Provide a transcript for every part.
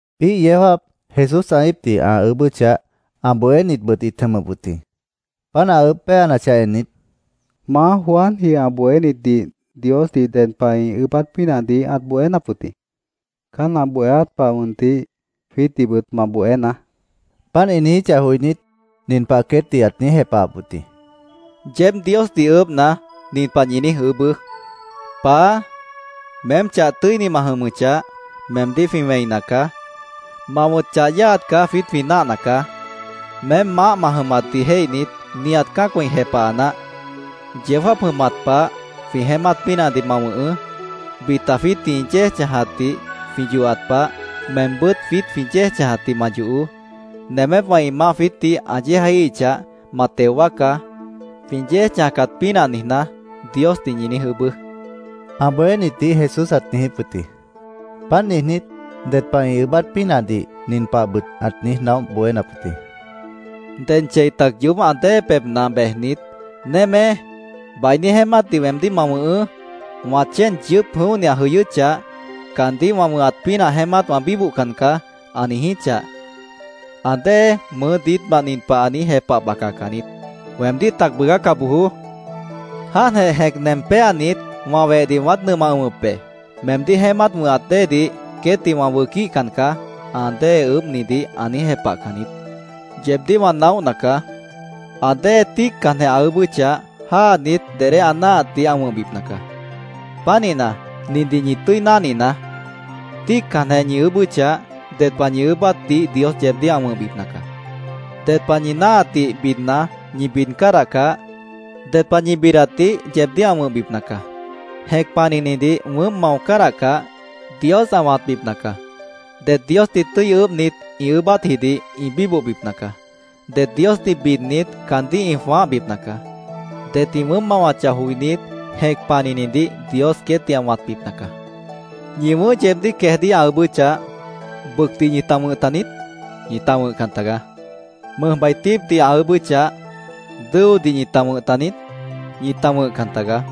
Biíh yeó jáap Jesús ã íipdih ã ʉʉ́bʉ́chah, ã bohénitbʉt ĩt jʉmʉp wʉt jĩ. Páant ã ʉʉ́bh péanachah ennit, —Maá, Juanji ã bohénitdih Diosdih ded pah ĩ ʉʉ́bát pínahdih ãt bohénap wʉt jĩ. Caán ã bohéát pah mʉntih jwiítdihbʉt ma bohénaá, ĩt niijíp wʉt jĩ. Páant ĩ niijíchah joinít, nin pah queétdih ãt niíj jepahap wʉt jĩ: —Yeéb Diosdih ʉʉ́bhna, nin pah ñi niíj ʉʉ́bʉ́: ‘Paá, meém chah tʉ́ini ma jʉmʉchah, meemdíh jwĩ wẽina caá. Ma wʉ̃t chah yáaat caá jwiít jwĩ náahna caá. Meém maáh ma jʉmatdih jéihnit, nihat cã́acwã ĩ jepaha naáh. Yeó jáap jʉmat pah jwĩ jeémát pínahdih ma wʉ̃hʉʉ́. Bita jwiítdih ĩ yéej chãjatdih jwĩ yohat pah, meembʉ́t jwiít jwĩ yéej chãjatdih ma yohoó. Nemépwã ĩ maáh jwiítdih ã yéejaíhichah, ma teo wáacá, jwĩ yéej chãjcat pínah niijná’, Diosdih ñi niíj ʉʉ́bʉ́, ã bohénitdih Jesús ãt niijíp wʉt jĩ. Páant niijnít, ded pah ĩ ʉʉ́bát pínahdih nin pahbʉt ãt niíj naóh bohénap wʉt jĩ: —Ded chei tac yoób ã dée pebhna bejnit, ‘Némé, bainí jeémátdih weemdíh ma wʉ̃hʉʉ́. Wã chéen yʉʉ́p jʉ̃óhni ã jʉyʉ́chah, caandíh wã wʉ̃hat pínah jeémát wã bíbohcan caá’, ã niijíchah, ã dée mʉʉ́ diítmant nin pah ã niíj jepah bacacan niít. ‘Weemdíh tac bʉʉgáca bojoó. Jáantjeh jẽc nem péanit, wã wehdih wãát nʉmah ʉ̃wʉp be. Meemdíh jeémát wʉ̃hat déedih, queétdih wã wʉquíhcan caá’, ã dée ʉʉ́bhnidih ã niíj jepahcan niít. Yeebdíh wã naóhna caá. Ã dée tíiccanjeh ã ʉʉ́bʉ́chah, jáanit dedé ã náahatdih ã wʉ̃hbipna caá. Pánihna, nindih ñi tʉ́i náhninaá: Tíiccanjeh ñi ʉʉ́bʉ́chah, ded pah ñi ʉʉ́bátdih Dios yeebdíh ã wʉ̃hbipna caá. Ded pah ñi náahatdih bidna, ñi bid cádahcah, ded pah ñi bidatdih yeebdíh ã wʉ̃hbipna caá. Jẽc panihnidih wʉʉ́mp mao cádahcah, Dios ã wãtbipna caá. Det Diosdih tʉ́i ʉʉ́bhnit, ĩ ʉʉ́bátjidih ĩ bíbohbipna caá. Det Diosdih bidnit, caandíh ĩ jwãáhbipna caá. Det ĩ wʉʉ́mp mawachah joinít, jẽc panihnidih Dios queétdih ã wãtbipna caá. ¿Ñi wʉ̃ʉ́h yeebdíh queejdíh ã ʉʉ́bʉ́chah, bʉcdih ñita wʉ̃h taniít? Ñita wʉ̃hcan tagaá. ¿Mʉjbai tíipdih ã ʉʉ́bʉ́chah, dʉ́odih ñita wʉ̃h taniít? Ñita wʉ̃hcan tagaá.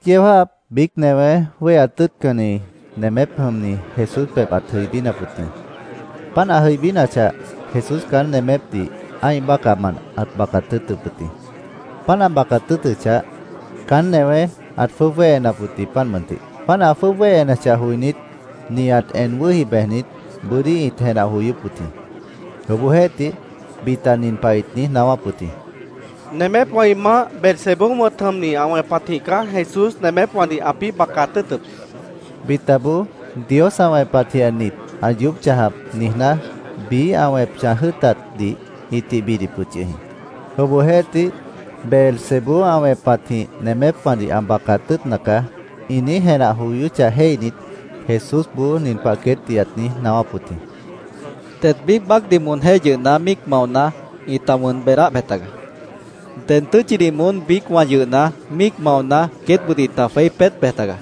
Biíh yeó jáap biíc newé wéheat tʉ́ʉtcanni nemép jʉmni Jesús pebh ãt jʉibínap wʉt jĩ. Páant ã jʉibínachah, Jesús caán nemépdih ã́ih bácahmant ãt bacat tʉ́ʉtʉp wʉt jĩ. Páant ã bacat tʉ́ʉtʉchah, caán newé ãt jwʉ́ʉb wéhenap wʉt jĩ, páant mʉntih. Páant ã jwʉ́ʉb wéhenachah joinít, nihat en wʉ́hi bejnit, bʉ́dí ĩt jenah joyóp wʉt jĩ. Obohjeéhtih, bita nin pah ĩt niíj naáwáp wʉt jĩ: “Nemépwã ĩ maáh, Beelzebú wʉ̃t jʉmni, ã wẽpatjĩh caá Jesús nemépwãdih ãpĩ́ bacat tʉ́ʉtʉp”, ĩt niijíp wʉt yʉh jĩ. Bitaboó, “Dios ã wẽpatjĩhjeh nit ã yoób chãjap”, niijná, biíh ã wẽp chãj jʉ́ʉtatdih ĩtih bidip wʉt yʉh jĩ. Obohjeéhtih, “Beelzebú ã wẽpatjĩh nemépwãdih ã bacat tʉ́ʉtna caá”, ĩ niíj jenah joyóchah jéihnit, Jesúsboó nin pah queétdih ãt niíj naáwáp wʉt jĩ: “Det biíc baácdih moonjéh yʉhna míic maona, ĩta wʉn beedáh bej tagaá. Ded tʉ́tchidih moón biícwã yʉhna, míic maona, queétbʉt ĩta jweí peét bej tagaá.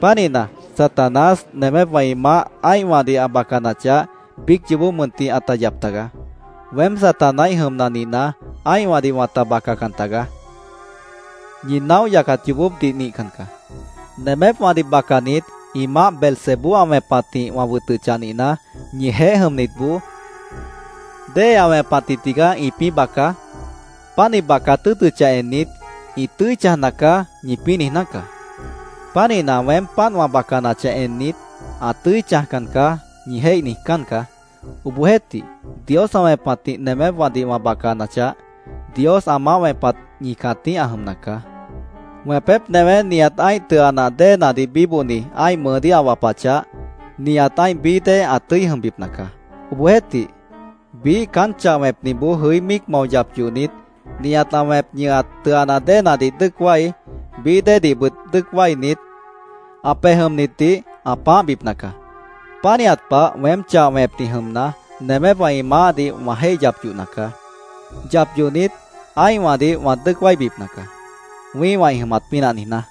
Pánihna, Satanás, nemépwã ĩ maáh ã́ihwãdih ã bacanachah, biíc yoobó mʉntih ãta yap tagaá. Weém Satanáíh jʉmna nihna, ã́ihwãdih wãta bacacan tagaá. Ñi naóh yacat yoobópdih nihcan caá. Nemépwãdih bacanit, ĩ maáh Beelzebú ã wẽpatjĩh wã wʉtʉchah nihna, ñijeéh jʉmnitboó ¿déhe ã wẽpatjĩh tigaá ĩpĩ́ baca? Páant ĩ bacat tʉ́ʉtʉchah ennit, ‘Ĩ tʉ́i chãjna caá’, ñipĩ́ niijná caá. Pánihna, weém páant wã bacanachah ennit, ‘Ã tʉ́i chãjcan caá’, ñi jéih niijcán caá. Obohjeéhtih, Dios ã wẽpatjĩh nemépwãdih wã bacanachah, Dios ã maáh wẽpat ñi cãtíh ã jʉmna caá. “Wẽpép newé nihat ã́ih tʉa nah déenadih bíbohni ã́ih mʉʉdíh ã wapachah, nihat ã́ih bií dée ã tʉ́i jʉmbipna caá. Obohjeéhtih, biíh caán chah wẽpniboó jʉí míic mao yap yohnit, nihat ã wẽp ñʉhat tʉa nah déenadih dʉ́ʉc wái, bií déedihbʉt dʉ́ʉc wáinit, ã pej jʉmnitdih ã pãáhbipna caá. Pánihat pah weém chah wẽpni jʉmna, nemépwã ĩ maáhdih wã jéih yap yohna caá. Yap yohnit, ã́ihwãdih wã dʉ́ʉc wáibipna caá, wĩ́ihwã ĩ jʉmat pínah niijná.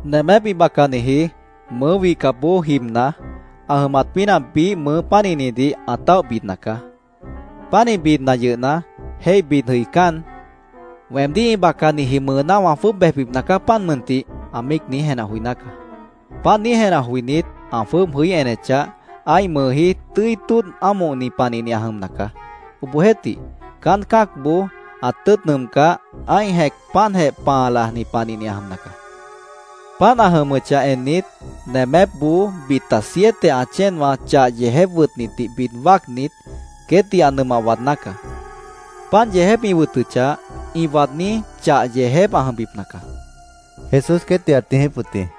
“Nemép ĩ bacaniji mʉʉ́ wihcapboó jibna, ã jʉmat pínah biíh mʉʉ pánihnidih ã táoh bidna caá. Pánih bidna yʉhna, jéih bid jʉicán, ‘Weemdíh ĩ bacaniji mʉʉná wã jwʉ́ʉb bejbipna caá, páant mʉntih’, ã míic niíj jenah joiná caá. Páant niíj jenah joinít, ã jwʉ́ʉb jʉí enechah, ã́ih mʉʉjí tʉ́i tóodh ámohni panihni ã jʉmna caá. Obohjeéhtih, caán cã́acboó ã tʉ́ʉt nʉʉmcáh, ã́ih jẽc páantjeh pãa lajni panihni ã jʉmna caá. Páant ã jʉmʉchah ennit, nemépboó bita siete ã chéenwã chah yeejép wʉtnitdih bid wáacnit, queétdih ã nʉmah waadná caá. Páant yeejép ĩ wʉtʉchah, ĩ waadní chah yeejép ã jʉmbipna caá”, Jesús queétdih ãt niijíp wʉt jĩ.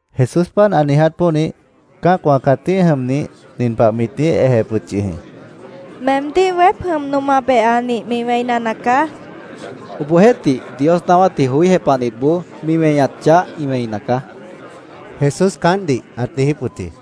Jesús páant ã niiját pónih, cã́acwã cãtíh jʉmnih nin pah mit niíj ejep wʉt yʉh jĩ: —¡Meemdíh weép jʉm noma behanih mi wẽina nacaá! mit niíj ejep wʉt jĩ. —Obohjeéhtih, Dios naáwátdih joí jepahnitboó mi weñat chah ĩ wẽina caá, Jesús caántdih ãt niijíp wʉt jĩ.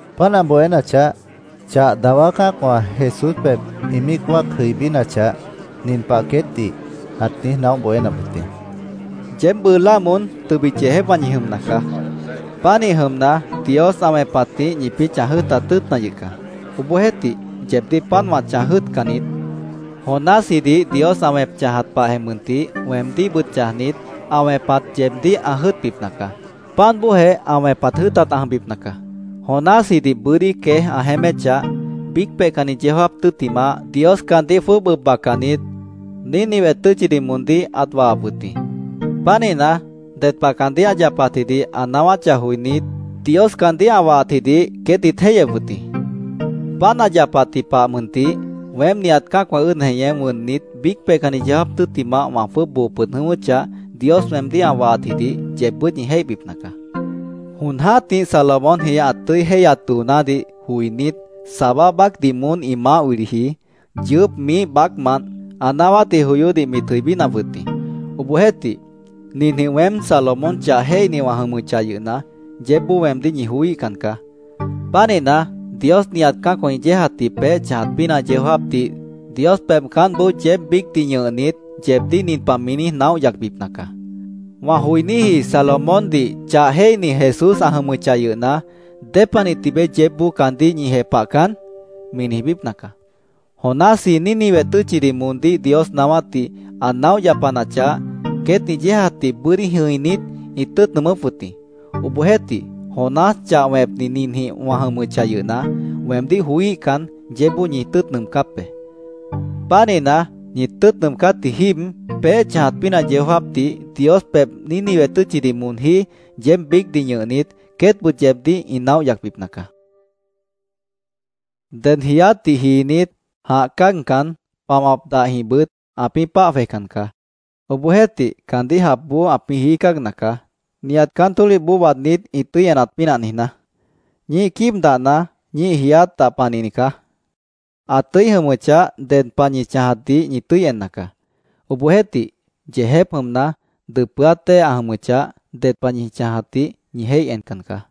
Páant ã bohénachah, chah dawá cã́acwã Jesús pebh ĩ míic wáac jʉibínachah, nin pah queétdih ãt niíj naóh bohénap wʉt jĩ: “Yeéb bʉʉ láa moón tʉbit yeejépwã ñi jʉmna caá. Pánihnit jʉmna, Dios ã wẽpatjĩh ñipĩ́ chãj jʉ́ʉtat tʉ́ʉtna yʉh caá. Obohjeéhtih, yeebdíh páant wã chãj jʉ́ʉtcan niít. Jonásjidih Dios ã wẽp chãjat pahjeh mʉntih weemdíhbʉt chãjnit, ã wẽpat yeebdíh ã jʉ́ʉtbipna caá. Páant bóojeh ã wẽpat jʉ́ʉtat ã jʉmbipna caá. Jonásjidih bʉ́dí queéj ã jeéméchah, biíc peihcanni yeó jáap tʉ́ttimah, Dios caandíh jwʉ́ʉb ʉb bacanit, Nínive tʉ́tchidih moondíh ãt wahap wʉt jĩ.Pánihna, ded pah caandíh ã yapatjidih ã naáwáchah joinít, Dios caandíh ã wahatjidih queét ĩt jéihyep wʉt jĩ. Páant ã yapatji pah mʉntih weém nihat cã́acwã ʉ́ʉd jeñé wʉnnit, biíc peihcanni yeó jáap tʉ́ttimah wã jwʉ́ʉb boo pʉd jʉ̃ʉ́wʉ́chah, Dios weemdíh ã wahatjidih yeebbʉ́t ñi jéihbipna caá. Jon jã́tih Salomónji ã tʉ́i jéihyat doonádih joinít, Sabá baácdih moón ĩ maáh wiliji, yʉʉ́p miíh baácmant ã naáwátdih joyódih mit jʉibínap wʉt jĩ. Obohjeéhtih, ninjĩh weém Salomón chah jéihni wã jʉmʉchah yʉhna, yeébboó weemdíh ñi joííhcan caá. Pánihna, Dios nihat cã́acwã ĩ yéejatji peéh chãjat pínah yeó jáapdih Dios pebh caántboó yeéb biícdih ñʉhnit, yeebdíh nin pah mi niíj naóh yacbipna caá: ‘Wã joiníji Salomóndih chah jéihni Jesús ã jʉmʉchah yʉhna, ¿dépanih tibeé yeébboó caandíh ñi jepahcan?’ mi niijbípna caá. Jonásji Nínive tʉ́tchidih moondíh Dios naáwátdih ã naóh yapanachah, queét ĩ yéejatdih bʉ́dí jʉ̃inít, ĩt tʉ́ʉt nʉʉmʉ́p wʉt jĩ. Obohjeéhtih, Jonás chah wẽpni ninjĩh wã jʉmʉchah yʉhna, weemdíh joííhcan, yeébboó ñi tʉ́ʉt nʉʉmcáp be. Pánihna, ñi tʉ́ʉt nʉʉmcátji jíib, peéh chãjat pínah yeó jáapdih Dios pebh Nínive tʉ́tchidih moonjí yeéb biícdih ñʉhnit, queétbʉt yeebdíh ĩ naóh yacbipna caá”, Jesús queétdih ãt niijíp wʉt jĩ. “Ded jiiátdih jiinít, jãh cáagcan, pamap dahjĩhbʉt ãpĩ́ páah jwejcan caá. Obohjeéhtih, caandíh japboó ãpĩ́ jií cáagna caá, nihat caán tólihboó waadnít ĩ tʉ́i enat pínah niijná. Ñíih quíib dahna ñíih jiiát dah panihni caá. Ã tʉ́i jʉmʉchah, ded pah ñi chãjatdih ñi tʉ́i enna caá. Obohjeéhtih, yeejép jʉmna, dʉpʉ́át dée ã jʉmʉchah, ded pah ñi chãjatdih ñi jéih encan caá.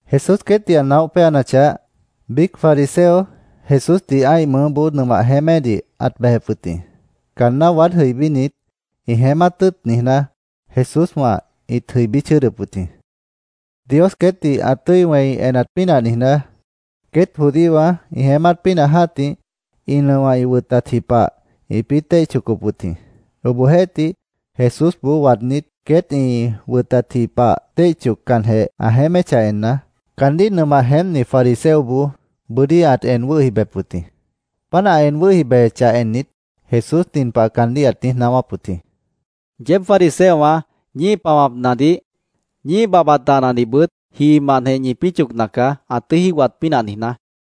Jesús queétdih ã naóh péanachah, biíc fariseo Jesúsdih ã́ih mʉʉ́boó nʉmah jeémédih ãt bejep wʉt jĩ. Caanná waád jʉibínit, ĩ jeémát tʉ́ʉt niijná, Jesúswã ĩt jʉibí chʉ́ʉdʉp wʉt jĩ. Dios queétdih ã tʉ́i wẽi enat pínah niijná, queét judíowã ĩ jeémát pínah jã́tih ĩ nʉowã ĩ wʉtatji pah ĩpĩ́ téih chocop wʉt jĩ. Obohjeéhtih, Jesúsboó waadnít, queét ĩ wʉtatji pah téih choccanjeh ã jeéméchah enna, caandíh nʉmah jeémpni fariseoboó bʉ́dí ãt en wʉ́hi bejep wʉt jĩ. Páant ã en wʉ́hi bejechah ennit, Jesús nin pah caandíh ãt niíj naáwáp wʉt jĩ: —Yeéb fariseowã ñíih pamapnadih, ñíih babhbat dahnadihbʉt jiimantjeh ñipĩ́ chocna caá, ã tʉ́i jígohat pínah niijná.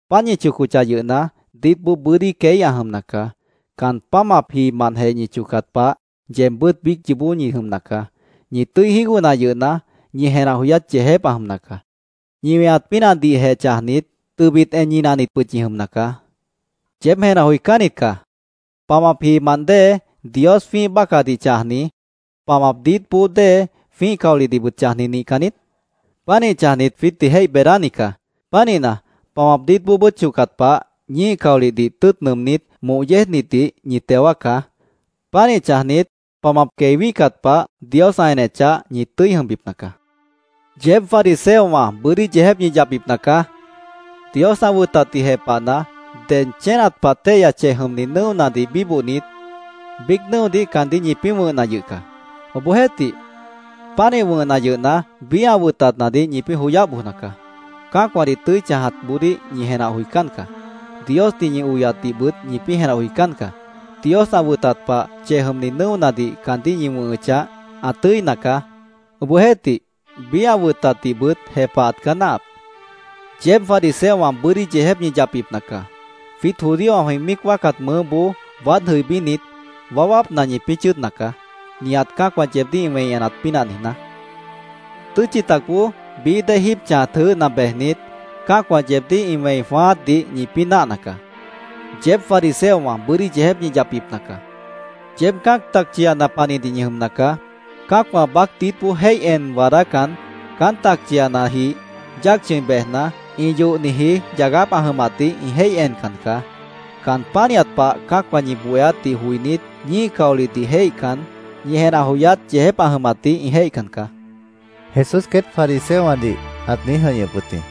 Páant ñi chocochah yʉhna, diítboó bʉ́dí queí ã jʉmna caá. Caan pámap jiimantjeh ñi chocat pah, yeebbʉ́t biíc yoobó ñi jʉmna caá. Ñi tʉ́i jígohna yʉhna, ñi jenah joyát yeejép ã jʉmna caá. Ñi weñat pínahdihjeh chãjnit, tʉbit en ñinahnitbʉt ñi jʉmna caá. ¡Yeéb jenah joicánnit caá! ¿Pamap jiimant dée, Dios jwĩ́ih bácahdih chãjni, pamap diítboó dée, jwĩ́ih caolihdihbʉt chãjni nihcan niít? Pánih chãjnit, jwiítdih jéih beedáni caá. Pánihna, pamap diítboobʉ́t chocat pah, ñíih caolihdih tʉ́ʉt nʉʉmnít, moh yéejnitdih ñi teo wáacá. Pánih chãjnit, pamap quei wíhcat pah, Dios ã enechah, ñi tʉ́i jʉmbipna caá. “¡Yeéb fariseowã bʉ́dí yeejép ñi yapbipna caá! Dios ã wʉtatdih jepahna, ded chénat pah téihya chej jʉmni nʉ́onadih bíbohnit, biíc nʉ́odih caandíh ñipĩ́ wʉ̃hna yʉh caá. Obohjeéhtih, pánih wʉ̃hna yʉhna, biíh ã wʉtatnadih ñipĩ́ joyáh bojna caá. Cã́acwãdih tʉ́i chãjatboodíh ñi jenah joicán caá. Diosdih ñi oyatdihbʉt ñipĩ́ jenah joicán caá. Dios ã wʉtat pah, chej jʉmni nʉ́onadih caandíh ñi wʉ̃hʉchah, ã tʉ́ina caá. Obohjeéhtih, biíh ã wʉtatdihbʉt jepahat caá náahap. “¡Yeéb fariseowã bʉ́dí yeejép ñi yapbipna caá! Jwiít judíowã jwĩ míic wáacat mʉʉ́boó waád jʉibínit, waáwápna ñipĩ́ chʉ́ʉdna caá, nihat cã́acwã yeebdíh ĩ wẽi enat pínah niijná. Tʉ́tchi tacboó bií dée jíib chãjat jʉʉ́hna bejnit, cã́acwã yeebdíh ĩ wẽi jwãáátdih ñipĩ́ náahna caá. “¡Yeéb fariseowã bʉ́dí yeejép ñi yapbipna caá! Yeéb cã́ac tacchiana panihnit ñi jʉmna caá. Cã́acwã baác diítboó jéih en waadácan, caán tacchianajih yáac chʉ̃i bejna, ĩ yohniji yagáp ã jʉmatdih ĩ jéih encan caá. Caan pánihat pah cã́acwã ñi bohéátdih joinít, ñíih caolihdih jéihcan, ñi jenah joyát yeejép ã jʉmatdih ĩ jéihcan caá”, Jesús queét fariseowãdih ãt niíj jʉ̃ihñʉp wʉt jĩ.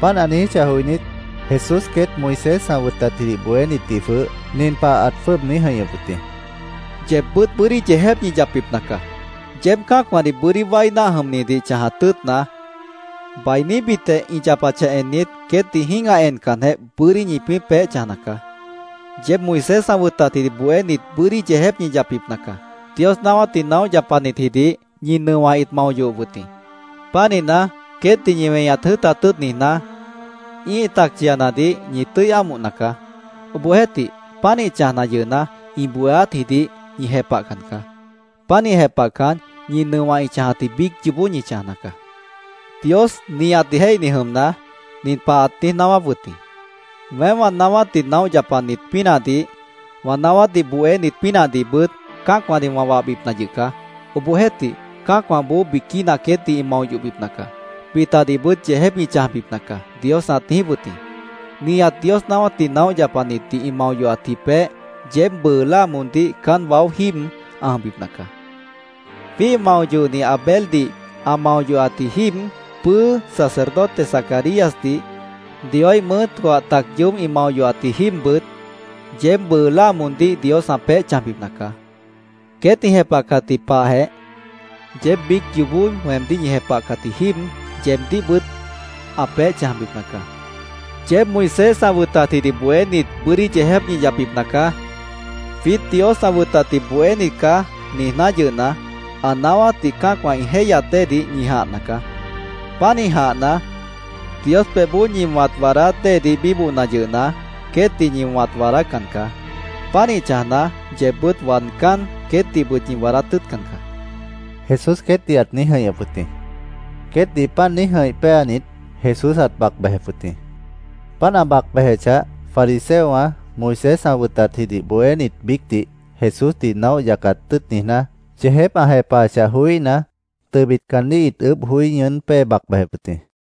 Páant ã niijíchah joinít, Jesús queét Moisés ã wʉtatjidih bohénitdih jwʉh nin pah ãt jwʉ́ʉb niíj jʉ̃ihñʉp wʉt jĩ: —¡Yeebbʉ́t bʉ́dí yeejép ñi yapbipna caá! Yeéb cã́acwãdih bʉ́dí wái náah jʉmnidih chãjat tʉ́ʉtna, bainíbitjeh ĩ yapachah ennit, queétdih jĩ́gah encanjeh, bʉ́dí ñipĩ́ peéh chãjna caá. “¡Yeéb Moisés ã wʉtatjidih bohénit bʉ́dí yeejép ñi yapbipna caá! Dios naáwátdih naóh yapanitjidih ñi nʉowã ĩt mao yohop wʉt jĩ. Pánihna, queétdih ñi weñat jʉ́ʉtat tʉ́ʉt niijná, ĩ́ih tacchianadih ñi tʉ́i ámohna caá. Obohjeéhtih, pánih chãjna yʉhna, ĩ bohéátjidih ñi jepahcan caá. Pánih jepahcan, ñi nʉowã ĩ chãjatji biíc yoobó ñi chãjna caá. “Dios, nihat jéihni jʉmna, nin pah ãt niíj naáwáp wʉt jĩ: ‘Weém wã naáwátdih naóh yapanit pínahdih, wã naáwátdih bohénit pínahdihbʉt cã́acwãdih wã wahbipna yʉh caá. Obohjeéhtih, cã́acwãboó biquína queétdih ĩ mao yohbipna caá. Bitadihbʉt yeejép ĩ chãjbipna caá’, Dios ãt niijíp wʉt jĩ. Nihat Dios naáwátdih naóh yapanitdih ĩ mao yohatji peéh yeéb bʉʉ láa moondíh caán waó jíib ã jʉmbipna caá. Jwíih mao yohni Abeldih ã mao yohatji jíib, pʉ́ʉ́ sacerdote Zacaríasdih, Dioíh mʉʉ́ coah tac yoób ĩ mao yohatji jíibbʉt, yeéb bʉʉ láa moondíh Dios ã peéh chãjbipna caá. Queét ĩ jepahcatji pahjeh, yeéb biíc yoobó weemdíh ñi jepahcatji jíib yeebdíhbʉt ã peéh chãjbipna caá. “¡Yeéb Moisés ã wʉtatjidih bohénit bʉ́dí yeejép ñi yapbipna caá! ‘Jwiít Dios ã wʉtatdih bohénit caá’, niijná yʉhna, ã naáwátdih cã́acwã ĩ jéihyat déedih ñi jãhna caá. Pánih jãhna, Dios pebhboó ñi wãt waadát déedih bíbohna yʉhna, queétdih ñi wãt waadácan caá. Pánih chãjna, yeebbʉ́t waadcán, queétdihbʉt ñi waadát tʉ́ʉtcan caá”, Jesús queétdih ãt niíj jʉ̃ihñʉp wʉt jĩ. Queétdih páant niíj jʉ̃ih péanit, Jesús ãt bac bejep wʉt jĩ. Páant ã bac bejechah, fariseowã, Moisés ã wʉtatjidih bohénit biícdih Jesúsdih naóh yacat tʉ́ʉt niijná, yeejép ã jepahachah joííhna, tʉbit caandíh ĩt ʉʉ́bh joí ñʉʉ́n pée bac bejep wʉt jĩ.